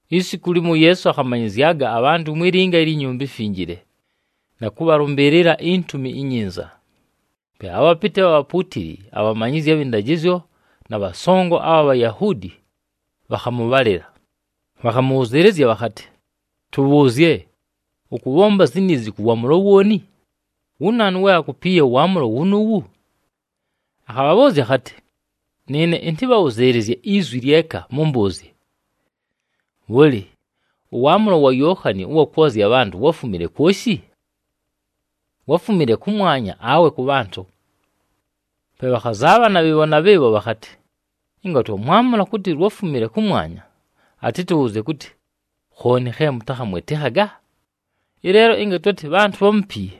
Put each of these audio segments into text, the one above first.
Isiku limo, uYeesu akhamanyɨzyaga abhantʉ mwi linga ilyi Nyumba iMfinjile, na kʉbhalʉmbɨɨlɨla iNtumi iNyinza. Pe abhapɨtɨ abha bhapuutili, abhamanyizyi abhɨ ndajɨzyo, na bhasongo abha Bhayahuudi bhakhamʉbhalɨla, bhakhamʉbhʉzɨɨlɨzya bhakhatɨ, “Tʉbhʉʉzye, ʉkʉbhomba ziniizi kʉ waamʉlo wooni? Wu naanu we akupiiye ʉwaamʉlo wunuuwu?” Akhabhabhʉʉzya akhatɨ, “Nɨɨne ɨntɨbhabhʉzɨɨlɨzye izwi lyeka mʉmbʉʉzye. Bhʉlɨ, ʉwaamʉlo wa Yookhani ʉwa kwozya abhantʉ wáfumile kwoshi? Wáfumile kʉmwanya awe kʉ bhantʉ?” Pe bhakhazaabhana bhɨɨbho na bhɨɨbho bhakhatɨ, “Ɨnga twamwamʉla kʉtɨ lwáfumile kʉmwanya, atɨtʉbhʉzɨɨlɨzye kʉtɨ, ‘Khooni khe mʉtakhamwɨtɨkhaga?’ Ɨleelo ɨnga twatɨ bhantʉ bhámupiiye,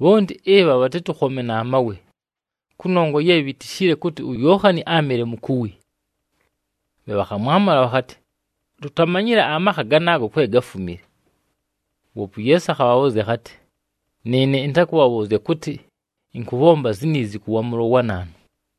bhonti ɨbha bhatɨtʉkhome na mawe, kʉnongwa ye bhitishile kʉtɨ uYookhani áamɨle mukuwi.” Pe bhakhamwamʉla bhakhatɨ, “Tutamanyile amakha ganaago kwe gáfumile.” Woope uYeesu akhabhabhʉʉzya akhatɨ, “Nɨɨne ɨntakʉbhabhʉʉzya kʉtɨ ɨnkʉbhomba ziniizi kʉ waamʉlo wa naanu.”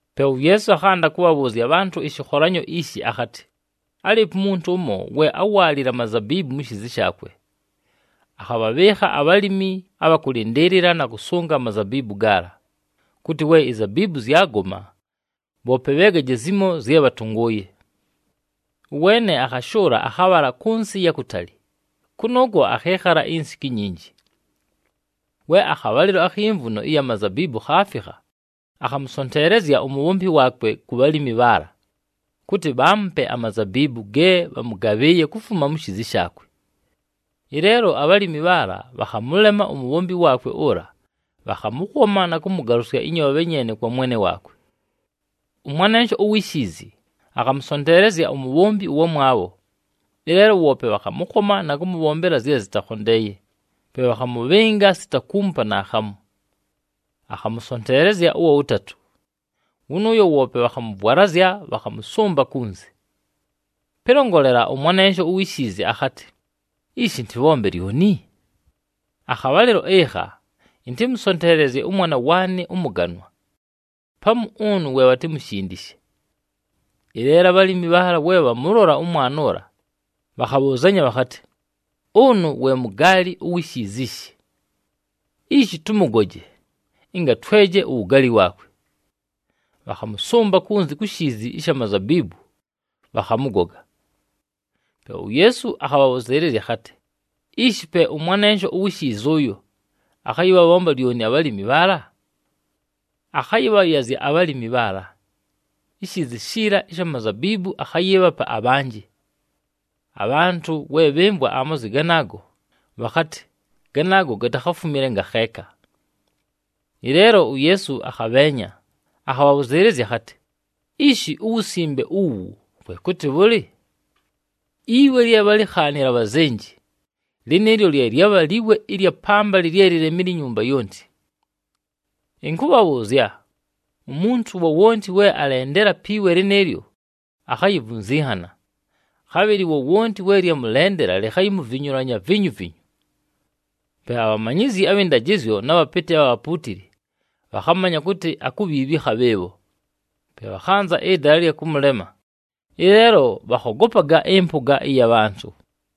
Pe uYeesu akhanda kʉbhabhʉʉzya abhantʉ ɨshɨkholanyo ishi akhatɨ, “Álɨɨpo umuntu ʉmo, we áwaalile amazabiibu mu shiizi shaakwe. Akhabhabhɨɨkha abhalimi abha kʉlɨndɨɨlɨla na kʉsʉnga amazabiibu gaala, kʉtɨ we izabiibu zyagoma, bhoope bheegaje zimo zye bhatʉngʉʉye. Ʉweene akhashʉʉla, akhabhala kʉ nsɨ ɨya kutali, kʉnʉʉkwo akhɨɨkhala insiku inyinji. We akhabhalɨlo akhi mvuno ɨya mazabiibu khaafikha, akhamʉsonteelezya umubhombi waakwe ku bhalimi bhaala, kʉtɨ bhaamupe amazabiibu ge bhamʉgabhɨɨye kufuma mu shiizi shaakwe. Ɨleelo abhalimi bhaala bhakhamʉlema umubhombi waakwe ʉla, bhakhamʉkhoma na kʉmʉgalʉsya ɨnyoobhe nyeene kwa mwene waakwe. “Ʉmwanensho uwi shiizi, akhamʉsonteelezya umubhombi ʉwamwabho. Ɨleelo woope bhakhamʉkhoma na kʉmʉbhombela zye zɨtakhondeeye, pe bhakhamʉbhɨnga sita kuumupa naakhamu. Akhamʉsonteelezya ʉwa wʉtatʉ. Wʉnʉʉyo woope bhakhamʉvwalazya, bhakhamʉsʉmba kunzi. “Pɨlongolela, ʉmwanensho uwi shiizi akhatɨ, ‘Ishi ɨntɨbhombe lyoni? Akhabhalɨlo ɨkha, ɨntɨmʉsonteelezye ʉmwana waanɨ ʉmʉganwa! Pamu ʉnʉ we bhatimushindishe.’ Ɨleelo abhalimi bhaala we bhamʉlola ʉmwana ʉla, bhakhabhʉʉzanya bhakhatɨ, ‘Ʉnʉ we mugaali uwi shiizi ishi. Ishi tʉmʉgoje, ɨnga tweje uwugaali waakwe.’ Bhakhamʉsʉmba kunzi ku shiizi ɨsha mazabiibu, bhakhamʉgoga.” Pe uYeesu akhabhabhʉzɨɨlɨzya akhatɨ, “Ishi pe ʉmwanensho uwi shiizi ʉyo akhayɨbhabhomba lyoni abhalimi bhaala? Akhayɨbhayazya abhalimi bhaala. Ishiizi shiila ɨsha mazabiibu, akhayɨɨbhapa abhanjɨ!” Abhantʉ we bhɨmvwa amazwi ganaago, bhakhatɨ, “Ganaago gatakhatufumile ngakheeka!” Ɨleelo uYeesu akhabheenya, akhabhabhʉzɨɨlɨzya akhatɨ, “Ishi uwusimbe uwu, kwe kʉtɨ bhʉlɨ? ‘Iwe lye bhálikhaanile abhazenji, lɨnɨɨlyo lye lyabha liwe ɨlya pambalɨ lye lilemile inyumba yonti.’ Ɨnkʉbhabhʉʉzya, umuntu wowonti we alendela pi we lɨnɨɨlyo, akhayivunzinhana. Khabhɨlɨ wowonti we lyamʉlendela, likhayimuvinyulanya vinyuvinyu.” Pe abhamanyizyi abhɨ ndajɨzyo na bhapɨtɨ abha bhapuutili, bhakhamanya kʉtɨ akubhiibhika bhɨɨbho. Pe bhakhanza ɨdala ɨlya kʉmʉlema, ɨleelo bhakhogopaga ɨmpʉga ɨya bhantʉ.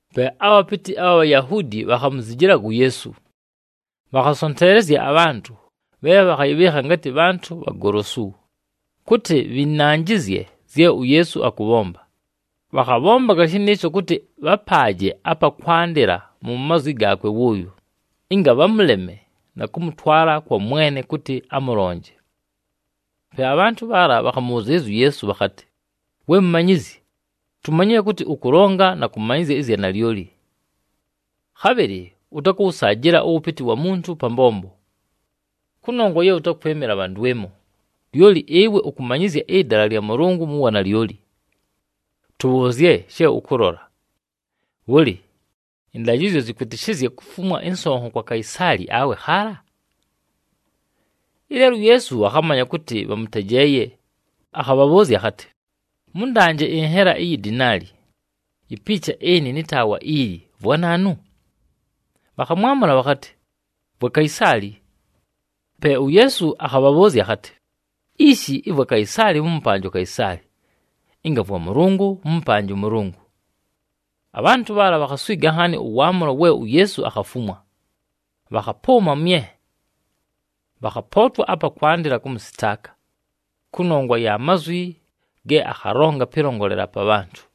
Pe abhapɨtɨ abha Bhayahuudi, bhakhamuzijilaga uYeesu. Bhakhasonteelezya abhantʉ bhe bhakhayɨbhɨɨkha ngatɨ bhantʉ bhagolosu, kʉtɨ bhɨnanjɨzye zye uYeesu akʉbhomba. Bhakhabhombaga shɨnɨɨsho kʉtɨ bhapaaje apa kwandɨla mu mazwi gaakwe wʉʉyo, ɨnga bhamʉleme na kʉmʉtwala kwa mwene kʉtɨ amʉlonje. Pe abhantʉ bhaala bhakhamʉbhʉzɨɨlɨzya uYeesu bhakhatɨ, “We Mumanyizyi, tumanyile kʉtɨ ʉkʉlonga na kʉmanyɨzya ɨzya nalyoli. Khabhɨlɨ ʉtakʉwʉsaajɨla ʉwʉpɨtɨ wa muntu pa mbombo, kʉnongwa ye ʉtakwɨmɨla bha ndwɨmo, lyoli ɨwe ʉkʉmanyɨzya ɨdala lya Mʉlʉngʉ mu wanalyoli. Tʉbhʉʉzye she ʉkʉlola. Bhʉlɨ, ɨndajɨzyo zɨkwɨtɨshɨzya kufumwa ɨnsonho kwa Kaisaali awe khaala?” Ɨleelo uYeesu akhamanya kʉtɨ bhamʉtejeeye, akhabhabhʉʉzya akhatɨ, “Mʉndanje ɨnhela iyi dinaali. Ipiicha ɨnɨ nɨ taawa ili, vwa naanu?” Bhakhamwamʉla bhakhatɨ, “Vwa Kaisaali.” Pe uYeesu akhabhabhʉʉzya akhatɨ, “Ishi, ɨvwa Kaisaali, mʉmʉpanje uKaisaali, ɨnga vwa Mʉlʉngʉ mʉmʉpanje ʉMʉlʉngʉ.” Abhantʉ bhaala bhakhaswiga nhaani ʉwaamʉlo we uYeesu akhafumwa, bhakhapʉʉma mye. Bhakhapootwa apa kwandɨla kʉmʉsɨtaaka, kʉnongwa ya mazwi ge akhalonga pɨlongolela pa bhantʉ.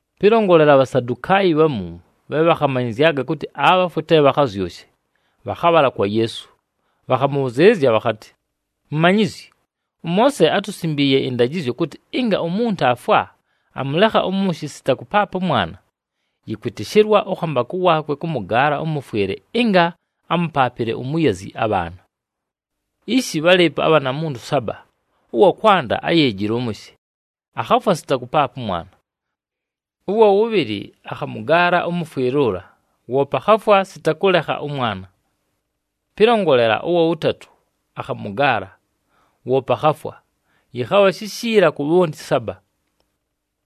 Pɨlongolela, aBhasadukaayi bhamu, bhe bhakhamanyɨzyaga kʉtɨ abhafwe te bhakhazyʉshe, bhakhabhala kwa Yeesu. Bhakhamʉbhʉzɨɨlɨzya bhakhatɨ, “Mumanyizyi, ʉMoose átusimbiiye ɨndajɨzyo kʉtɨ, ɨnga umuntu aafwa, amʉlekha ʉmʉshɨ sita kʉpaapa ʉmwana, yɨkwɨtɨshɨlwa ʉkhambakʉ waakwe kʉmʉgaala ʉmʉfwɨle ɨnga amʉpaapɨle umuyazi abhaana. Ishi bhálɨɨpo abhanamuntu saba. Ʉwa kwanda áyeejile ʉmʉshɨ, akhafwa sita kʉpaapa ʉmwana. Ʉwa wʉbhɨlɨ, [akhamʉgaala ʉmʉfwɨle ʉla, woope akhafwa sita kʉlekha ʉmwana]. Pɨlongolela, ʉwa wʉtatʉ akhamʉgaala, woope akhafwa. Yɨkhabha shishiila ku bhonti saba.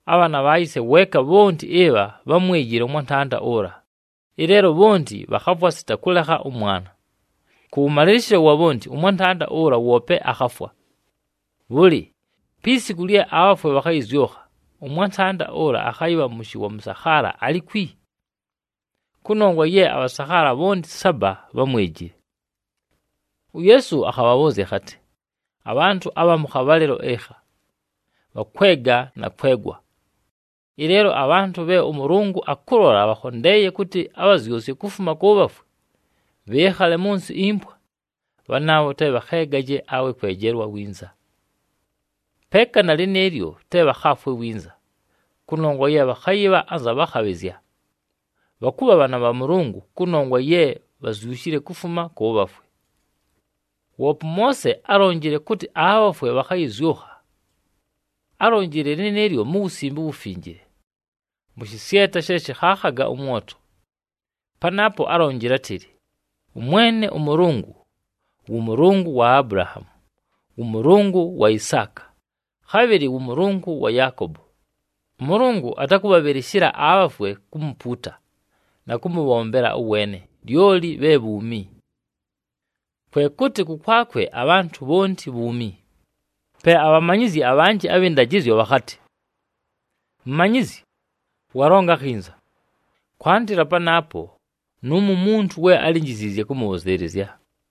Abhaana bha yise weeka bhonti ɨbha bhámwejile ʉmwantanda ʉla, ɨleelo bhonti bhakhafwa sita kʉlekha ʉmwana. Kʉwʉmalɨlɨshɨlo wa bhonti, ʉmwantanda ʉla woope akhafwa. Bhʉlɨ, pi siku lye abhafwe bhakhayɨzyʉkha, ʉmwantanda ʉla akhayɨbha mʉshɨ wa mʉsakhaala alikwi? Kʉnongwa ye abhasakhaala bhonti saba bhámwejile.” UYeesu akhabhabhʉʉzya akhatɨ, “Abhantʉ abha mʉ khabhalɨlo ɨkha, bhakwega na kwegwa. Ɨleelo abhantʉ bhe ʉMʉlʉngʉ akʉlola bhakhondeeye kʉtɨ abhazyʉsye kufuma kʉ bhafwe, bhɨɨkhale mʉ nsɨ impwa, bhanaabho te bhakheegaje, awe kwejelwa winza. Peeka na lɨnɨɨlyo te bhakhaafwe winza, kʉnongwa ye bhakhayɨbha anza bhakhabhɨzya. Bhakʉbha bhaana bha Mʉlʉngʉ, kʉnongwa ye bhazyushile kufuma kʉ bhafwe. “Woope ʉMoose álonjile kʉtɨ abhafwe bhakhayɨzyʉkha. Álonjile lɨnɨɨlyo mu Wusimbe uWufinjile, mʉ shɨsyeta she shɨkhaakhaga ʉmwoto. Panaapo álonjile átɨlɨ ʉMwene ʉMʉlʉngʉ ‘wʉ Mʉlʉngʉ wa Abulahaamu, wʉ Mʉlʉngʉ wa Isaaka, khabhɨlɨ wʉ Mʉlʉngʉ wa Yaakobo.’ ɄMʉlʉngʉ atakʉbhabhɨlɨshɨla abhafwe kumupuuta na kʉmʉbhombela ʉweene, lyoli bhe bhuumi. Kwe kʉtɨ kʉkwakwe abhantʉ bhonti bhuumi.” Pe abhamanyizyi abhanjɨ abhɨ ndajɨzyo bhakhatɨ, “Mumanyizyi, walonga akhinza!” Kwandɨla panaapo, nʉʉmo umuntu we álinjiziizye kʉmʉbhʉzɨɨlɨzya.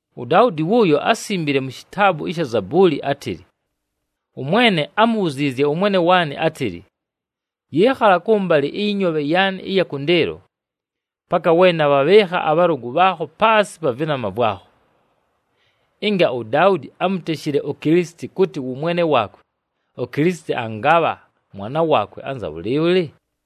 UDaudi wʉʉyo, ásimbile mu shitaabu ɨsha Zabuuli, átɨlɨ, ‘ɄMwene ámubhuziizye ʉMwene waanɨ átɨlɨ, “Yɨɨkhala kʉmbalɨ ɨyɨ nyoobhe yaanɨ ɨya kʉndɨɨlo, paka we nabhabhɨɨkha abhalʉgʉ bhaakho paasɨ pa vɨnama vwakho.”’ Ɨnga uDaudi ámuteshile uKilisiti kʉtɨ wʉ Mwene waakwe, uKilisiti angabha mwana waakwe anza bhʉlɨɨbhʉlɨ?”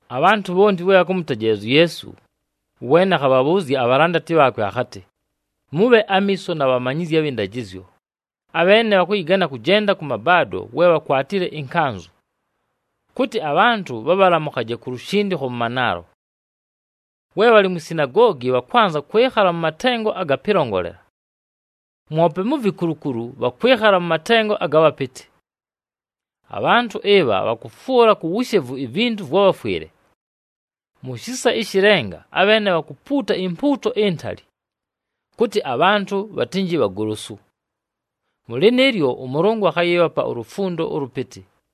Abhantʉ bhonti we bhakʉmʉtejeelezya uYeesu, ʉweene akhabhabhʉʉzya abhalandati bhaakwe akhatɨ, “Mʉbhe amiiso na bhamanyizyi abhɨ ndajɨzyo, abheene bhakʉyɨgana kʉjenda kʉ mabaado we bhakwatile ɨnkanzʉ, kʉtɨ abhantʉ bhabhalamʉkhaje ku lushindikho mʉ manaalo. We bhalɨ mwi sinagoogi, bhakwanza kwɨkhala mʉ matengo aga pɨlongolela. Mwope mu vikulukulu bhakwɨkhala mʉ matengo aga bhapɨtɨ. Abhantʉ ɨbha bhakʉfwʉla ku wushevu ivintu vwa bhafwɨle! Mu shisa ɨshɨ lenga abheene bhakupuuta impuuto intali, kʉtɨ abhantʉ bhatɨnjɨ bhagolosu. Mʉ lɨnɨɨlyo, ʉMʉlʉngʉ akhayɨɨbhapa ulufundo ʉlʉpɨtɨ!”